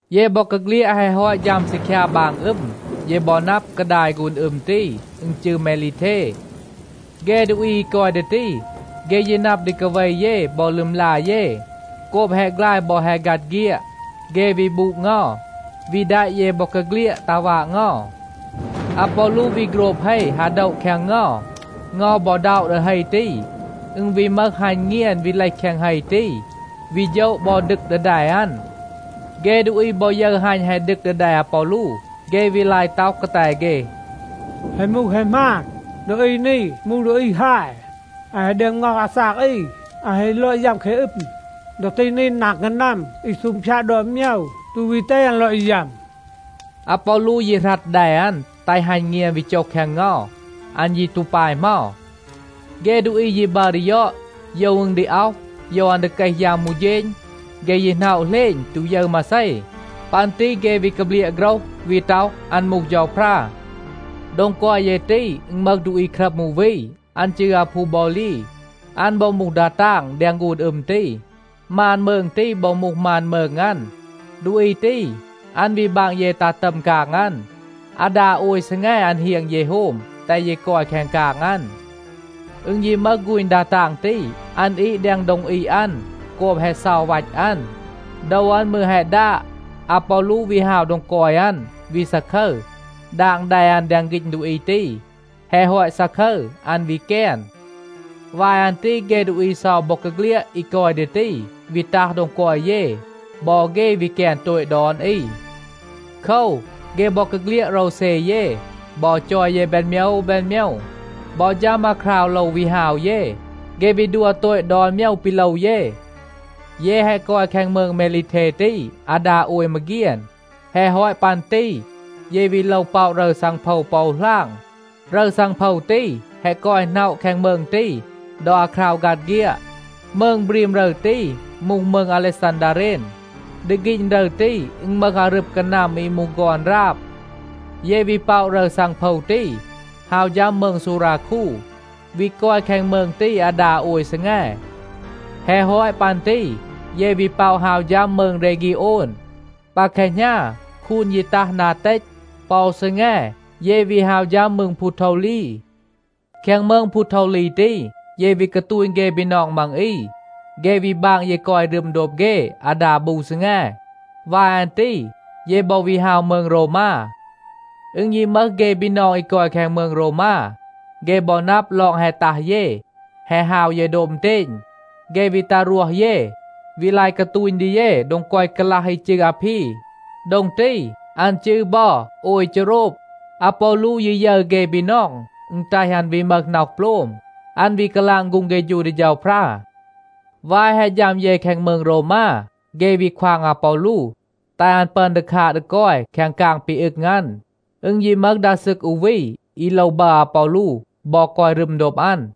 เย บอกาเฆลียด แฮะ ฮอต ฌัม ซีคยา บาง อึม, เย บอ นับ, กาดาย ฆูน อึม ตี, อึณ จืร เมลีเท. เฆ ดูอี อี กอย ดี ตี, เฆ ยี นับ ดี กาเว เย บอ ลึมลา เย. โกบ แฮะ ฆลาย บอ แฮะ ฆัด เฆียด, เฆ วี บูด เงา, วี แดะ เย บอกาเฆลียด ตัห วาด เงา. อาปอลู วี โฆรบ เฮ ฮา โดะ แคง เงา. เงา บอ ด็อะ ดี เฮ ตี, อึณ วี มึห ฮัณ เงียน วี เลห แคง เฮ ตี, วี โฌะ บอ ดึก ดี แด อัน. เฆ ดูอี บอ ยึร ฮัณ แฮะ ดึก ดี แด อาปอลู, เฆ วี ลาย ต็อห กาแต เฆ, “แฮะ มูห แฮะ หมาน, ดูอี นี มูห ดูอี ฮาย. อัน แฮะ ดึอม ง็อห อาซาก อี. อัน แฮะ ลอด ยัม แคง อึม. ดอ ตี นี นาง กานัม อี ซูงพยาด ดอน โมยว ตู วี แตห อัน ลอด ยัม.” อาปอลู ยี หรัด แด อัน, แตห ฮัณ เงียน วี โจห แคง เงา. อัน ยี ตู ปาย เหมา. เฆ ดูอี ยี บัร ดี ยอด, โยว อึณ ดี อ็อห, โยว อัน ดี เกห ยัม อู เฌณ. เฆ ยี หน็อะ เหลณ, ตู ยึร มาเซ. ปัน ตี เฆ วี กาเบลียะ โฆรห, วี ต็อห, อัน มูห เฌาพรา. โดง กอย เย ตี, อึณ มึห ดูอี ครัม อู วี, อัน จืร อาพูบอลี. อัน บอ มูห ดา ตาง แดง ฆูน อึม ตี. มาน มืง ตี บอ มูห มาน มืง อัน. ดูอี ตี, อัน วี บาง เย ตัห ตัม กาง อัน, อาดา โอย ซีแง อัน เฮียง เย โฮม, แตห เย กอย แคง กาง อัน. อึณ ยี มึห ฆูณ ดา ตาง ตี, อัน อีด แดง โดง อีด อัน โกบ แฮะ เซา วัต อัน, โดว อัน มืร แฮะ ดาด. อาปอลู วี ฮาว โดง กอย อัน, วี ซาคึร, ดาง แด อัน แดง ฆีณ ดูอี ตี. แฮะ ฮอต ซาคึร, อัน วี แกน. วาย อัน ตี เฆ ดูอี เซา บอกาเฆลียด อี กอย ดี ตี, วี ตัห โดง กอย เย. บอ เฆ วี แกน โตต ดอน อี. โคว, เฆ บอกาเฆลียด โรวเซ เย บอ จอย เย แบน โมยว แบน โมยว. บอ ฌัม อาคราว โลว วี ฮาว เย, เฆ วี ดัว โตต ดอน โมยว ปี โลว เย. เย แฮะ กอย แคง มืง เมลีเท ตี อาดา โอย มาเฆียน. แฮะ ฮอต ปัน ตี เย วี โลว ป็อะ รึร ซังโพว ปอ อู หลาง. รึร ซังโพว ตี แฮะ กอย หน็อะ แคง มืง ตี ดอ อาคราว ฆัด เฆียด. มืง บรีม รึร ตี มูห มืง อาเลซันดาเรน. ดี ฆีณ รึร ตี, อึณ มึห อารึบ กานัม อี มูห ฆอน ราบ. เย วี ป็อะ รึร ซังโพว ตี, ฮาว ฌัม มืง ซูราคู, วี กอย แคง มืง ตี อาดา โอย ซีแง. แฮะ ฮอต ปัน ตี เย วี ป็อะ ฮาว ฌัม มืง เรฆีโอน. ปา แคหณา คูน ยี ตัห นา เตต. ปอ อู ซีแง, เย วี ฮาว ฌัม มืง พูโทวลี. แคง มืง พูโทวลี ตี, เย วี กาตูณ เฆ บีนอง มัง อี. เฆ วี บาง เย กอย รึม โดบ เฆ อาดา บู ซีแง. วาย อัน ตี เย บอ วี ฮาว มืง โรวมา. อึณ ยี มึห เฆ บีนอง อี กอย แคง มืง โรวมา, เฆ บอ นับ ลอง แฮะ ตัห เย, แฮะ ฮาว เย โดบ อึณเตณ, เฆ วี ตัห รวห เย, วี ลาย กาตูณ ดี เย โดง กอย กาลัห อี จืร อาพี. โดง ตี, อัน จืร บอ โอย เฌโรบ. อาปอลู ยี ยึร เฆ บีนอง, อึณ แตห อัน วี มึห น็อห โปลม. อัน วี กาลาง ฆูง เฆฌู ดี เฌาพรา. วาย แฮะ ฌัม เย แคง มืง โรวมา, เฆ วี ควาง อาปอลู, แตห อัน ปึอน ดี คาด ดี กอย แคง กาง ปี อึง อัน. อึณ ยี มึห ดา ซึก อู วี, อี โลว บัร อาปอลู บอ กอย รึม โดบ อัน.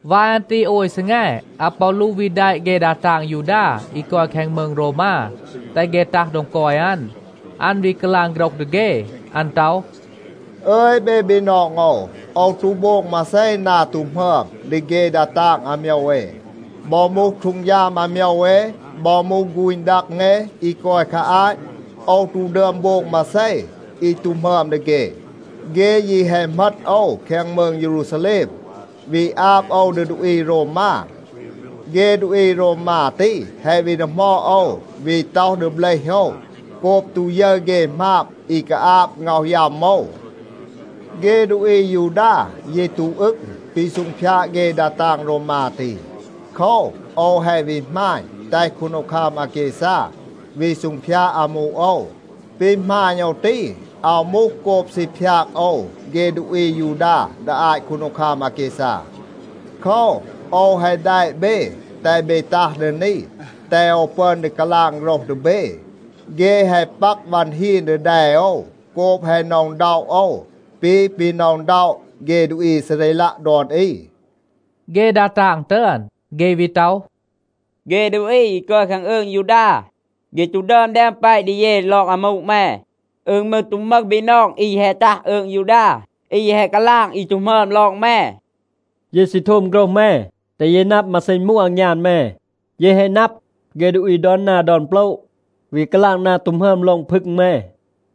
วาย อัน ตี โอย ซีแง, อาปอลู วี แดะ เฆ ดา ตาง ยูดา อี กอย แคง มืง โรวมา, แตห เฆ ตัห โดง กอย อัน. อัน วี กาลาง โฆรห ดี เฆ. อัน ต็อห, “อึย เบ บีนอง โอว. โอว ตู โบง มาเซ นา ตู หมึอม ดี เฆ ดา ตาง อาโมยว เอ. บอ มูห ฮีด อาโมยว เอ, บอ มูห ฆูณ ดัง เอ อี กอย คา อาต โอว ตู ดึอม โบง มาเซ อี ตู หมึอม ดี เฆ. เฆ ยี แฮะ เหมต โอว แคง มืง เยรูซาแลม, วี อาบ โอว ดี ดูอี โรวมา. เฆ ดูอี โรวมา ตี แฮะ วี ดีหมอด โอว, วี ต็อห ดี เบลห โอว, โกบ ตู ยึร เฆ หมาบ อี กาอาบ ง็อห ยัม โอว. เฆ ดูอี อายูดา ยี ตู อึง ปี ซูงพยาด เฆ ดา ตาง โรวมา ตี. โคว, โอว แฮะ วี หมาณ, แตห คูนดีคัม อาแกซา วี ซูงพยาด อามู โอว. ปี หมาณ โอว ตี, อาว มูห โกบ ซี พยาก โอว เฆ ดูอี อายูดา ดี อาต คูนดีคัม อาแกซา. โคว, โอว แฮะ แดะ เบ, แตห เบ ตัห ดี นี, แตห โอว ปึอน ดี กาลาง โฆรห ดี เบ. เฆ แฮะ ปัก วัน ฮีน ดี แด โอว โกบ แฮะ หน็อะ อึณด็อะ โอว ปี ปี หน็อะ อึณด็อะ เฆ ดูอี อีซาเรลัะ ดอน อี.” เฆ ดา ตาง ตึอน, เฆ วี ต็อห, “เฆ ดูอี อี กอย แคง อืง ยูดา, เฆ ตู ดึอม แดม แปะ ดี เย ลอง อามู แม. อึณ มืร ตู มึห บีนอง อี แฮะ ตัห อืง ยูดา, อี แฮะ กาลาง อี ตู หมึอม ลอง แม. เย ยี ซี โทม โฆรห แม, แตห เย นับ มาเซ อึณ มูห อางยาน แม. เย แฮะ นับ, เฆ ดูอี ดอน นา ดอน โปละ วี กาลาง นา ตู หมึอม ลอง พึง แม.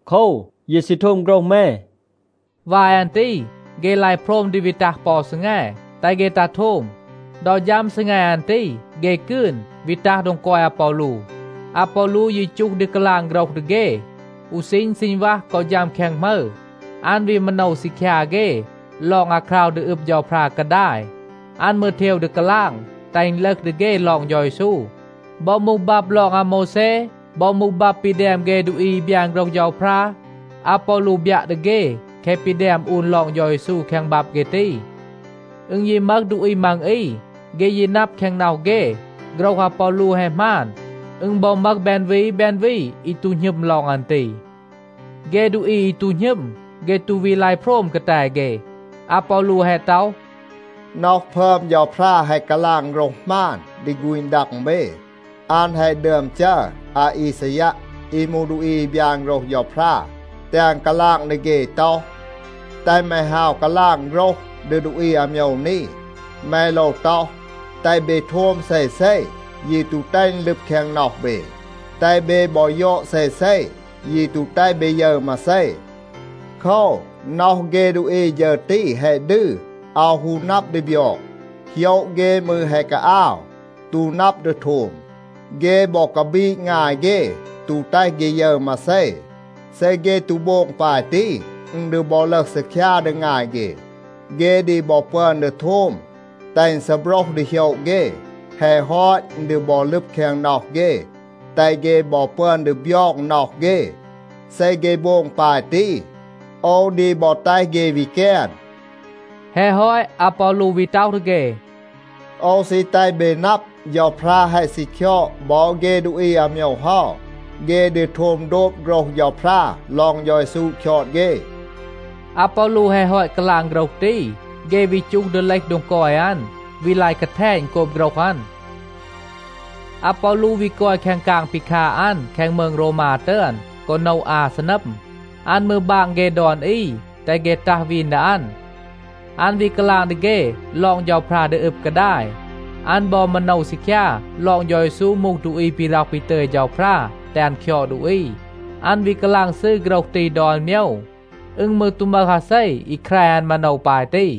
โคว, เย ซี โทม โฆรห แม.” วาย อัน ตี เฆ ลาย โพรม ดี วี ตัห ปอ อู ซีแง, แตห เฆ ตัห โทม. ดอ ฌัม ซีแง อัน ตี, เฆ กืน วี ตัห โดง กอย อาปอลู. อาปอลู ยี จูห ดี กาลาง โฆรห ดี เฆ อู ซีณ ซีณวัห กอ ฌัม แคง หมึร. อัน วี มาโนว ซีคยา เฆ ลอง อาคราว ดี อึบ เฌาพรา กาดาย. อัน มืร เทว ดี กาลาง, แตห อึณ ลึห ดี เฆ ลอง เฌา เยซู. บอ มูห บับ ลอง อาโมวแซ, บอ มูห บับ ปี แดม เฆ ดูอี อี บยาน โฆรห เฌาพรา, อาปอลู บยัะ ดี เฆ แคะ ปี แดม อูน ลอง เฌา เยซู แคง บับ เฆ ตี. อึณ ยี มึห ดูอี มัง อี, เฆ ยี นับ แคง น็อห เฆ, โฆรห อาปอลู แฮะ หมาน. อึณ บอ มึห แบน วี แบน วี, อี ตู หณึม ลอง อัน ตี. เฆ ดูอี อี ตู หณึม, เฆ ตู วี ลาย โพรม กาแต เฆ. อาปอลู แฮะ ต็อห, “น็อห พึอม เฌาพรา แฮะ กาลาง โฆรห หมาน ดี ฆูณ ดัง เบ. อัน แฮะ ดึอม จัร อาอีซายัะ อี มูห ดูอี อี บยาน โฆรห เฌาพรา, แตห อัน กาลาง ดี เฆ ต็อห, ‘แตห แม ฮาว กาลาง โฆรห ดี ดูอี อาโมยว นี. แม โลว ต็อห, “แตห เบ โทม เซเซ, ยี ตู แตห อึณ ลึบ แคง น็อห เบ. แตห เบ บอ ยอด เซเซ, ยี ตู แตห เบ ยึร มาเซ.” โคว, น็อห เฆ ดูอี ฌึร ตี แฮะ ดืร, อาว ฮู นับ ดี บยอง. โหยะ เฆ มืร แฮะ กาอาว, ตู นับ ดี โทม. เฆ บอ กาบีด งาย เฆ, ตู แตห เฆ ยึร มาเซ. เซ เฆ ตู โบง ปาย ตี, อึณ ดี บอ ลึห ซีคยา ดี งาย เฆ. เฆ ดี บอ ปึอน ดี โทม, แตห อึณ ซีโบรห ดี โหยะ เฆ. แฮะ ฮอต, อึณ ดี บอ ลึบ แคง น็อห เฆ, แตห เฆ บอ ปึอน ดี บยอง น็อห เฆ. เซ เฆ โบง ปาย ตี, โอว ดี บอ แตห เฆ วี แกน.’” แฮะ ฮอต อาปอลู วี ต็อห ดี เฆ, “โอว ซี แตห เบ นับ, เฌาพรา แฮะ ซี คยอด บอ เฆ ดูอี อาโมยว เฮา. เฆ ดี โทม โดบ โฆรห เฌาพรา ลอง เฌา เยซู คยอด เฆ.” อาปอลู แฮะ ฮอต กาลาง โฆรห ตี, เฆ วี จูห ดี เลห โดง กอย อัน, วี ลาย กาแทณ โกบ โฆรห อัน. อาปอลู วี กอย แคง กาง ปี คาด อัน แคง มืง โรวมา ตึอน กอ โนะ อา ซีนัม. อัน มืร บาง เฆ ดอน อี, แตห เฆ ตัห วีน ดี อัน. อัน วี กาลาง ดี เฆ ลอง เฌาพรา ดี อึบ กาดาย. อัน บอ มาโนว ซีคยา ลอง เฌา เยซู มูห ดูอี ปี ร็อห ปี ตึย เฌาพรา แตห อัน คยอด ดูอี. อัน วี กาลาง ซืร โฆรห ตี ดอน โมยว. อึณ มืร ตู มึห อาเซ อี แคร อัน มาโนว ปาย ตี.